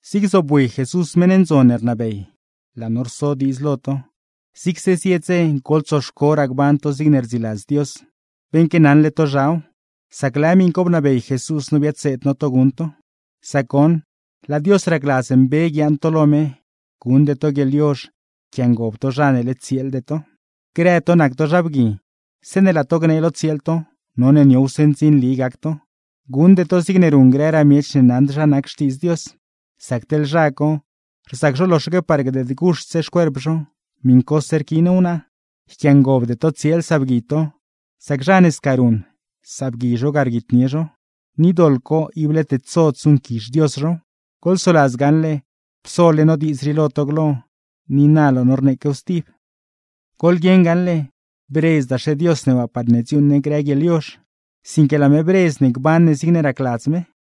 Zig zobwi Jesús meṉ ndzon ne rnabey, laa no rso diidz lo to: zigse zie dze goḻtsoxcoraa gban to zigne rdziladz Dios, beṉque naṉle to zhaw, sac lëë miṉ co bnabey Jesús no biadseed no to guṉ to. Sac goṉ, laa Dios racladz mbe guiaaṉ to lo me, guṉde to guieḻyozh yquiangob to zha ne led tsieelde to. Grë zha bgui, zeeṉe laa zho gnee lo tsieel zho, none niowse ndzinli gac zho; guṉd zho zigne ruṉ grëraa miech ne naṉd zha nac Xtiidz Dios; sac teḻ zha co, rzac zho loxaque par gdeedse guxt xcuerp zho, miṉcose rquiin wnaa. Niicle yquiangobde to tsieel sabgui to; sac zha ne sca ruṉ, sabgui zho ga rguitnie zho; ni doḻ co ible tedsod zuṉquizh Dios zhow. Goḻsoladz gaṉle psole no diidz rii lo to glo, ni na laa no rneequew stib. Goḻguieṉ gaṉle, bredzdaxe Dios ne waa parne dziuuṉ ne grë guieḻyozh, sinque laa me bredz ne gban ne zigne racladz me.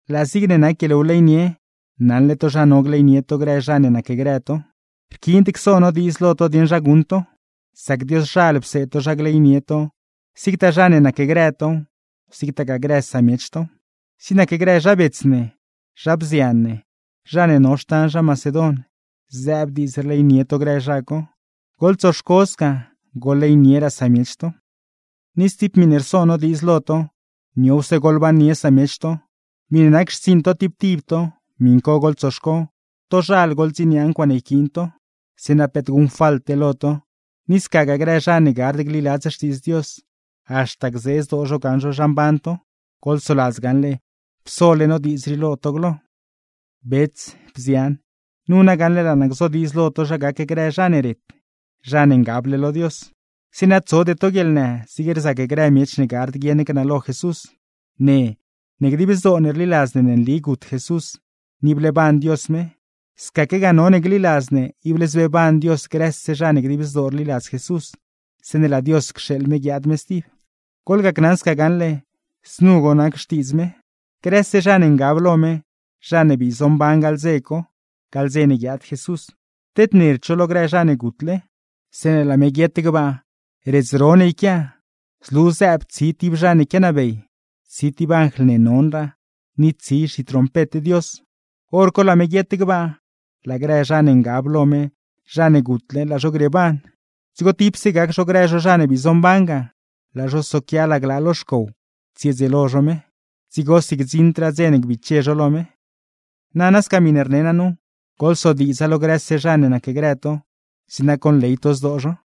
Laa zig nac guieḻwleynie, naṉle to zha no gleynie to grë zha ne nacgrë to. Rquiind cso no diidz lo to dieṉ zha guṉ to, sac Dioszhal pseed to zha gleynie to zigtaa zha ne nacgrë tow, zigtagaa grë samiech tow. Zig nac grë zha bets ne, zha bzian ne, zha ne no xtan zha Macedon, zëëb diidz rleynie to grë zha co. Goḻtsoxco sca, goḻleynieraa samiech to. Ni stib miṉe rso no diidz lo to: niowse goḻbannie samiech to. Miṉe nac xtsiiṉ to tib tib to, miṉ co goḻtsoxco, tozhal goḻdziniaa ncuaaṉe yquiin to; zeeṉa peet guṉfalte lo to, ni scagaa grë zha ne gard gliladz Xtiidz Dios, haxta gzee zdoo zho gaṉ zho zha mban to. Goḻsoladz gaṉle psole no diidz rii lo to glo. Bets, bzian, nu na gaṉle laa naa gzodiidz lo to zha gac grë zha ne ret, zha ne ngable lo Dios; zeeṉa tsode to guieḻnë zig rzac grë miech ne gard guieṉ gnalo Jesús. Ne, ne dib zdoo ne rliladz ne nli gut Jesús ni bleeban Dios me; scaquegaa none gliladz ne ible zbeeban Dios grëse zha ne dib zdoo rliladz Jesús, zeeṉe laa Dios cxeeḻ me guiaad me stib. Goḻgacnaṉ sca gaṉle, znu goṉ nac xtiidz me: Grëse zha ne ngab lo me, zha ne bii zomban gaḻ dze co (gaḻ dze ne guiaad Jesús) tednerd zho lo grë zha ne gutle. Zeeṉe laa me guiet gbaa, redz ro ne yquia, zlu zëëb tsi tib zha ne quianabey, tsi tib anjl ne nonraa, ni tsi zhitrompet Dios; hor co laa me guiet gbaa, laa grë zha ne ngab lo me, zha ne gutle, laa zho grieeban. Dzigo tipse gac zho grë zho zha ne bii zomban ga, laa zho soquia laglaa lo xcow tsiedzieelo zho me; dzigosi gdziṉdraa dze ne gbiche zho lo me. Nana sca miṉe rne naa nu, goḻsodiidza lo grëse zha ne nacgrë to; zeeṉa conley to zdoo zho.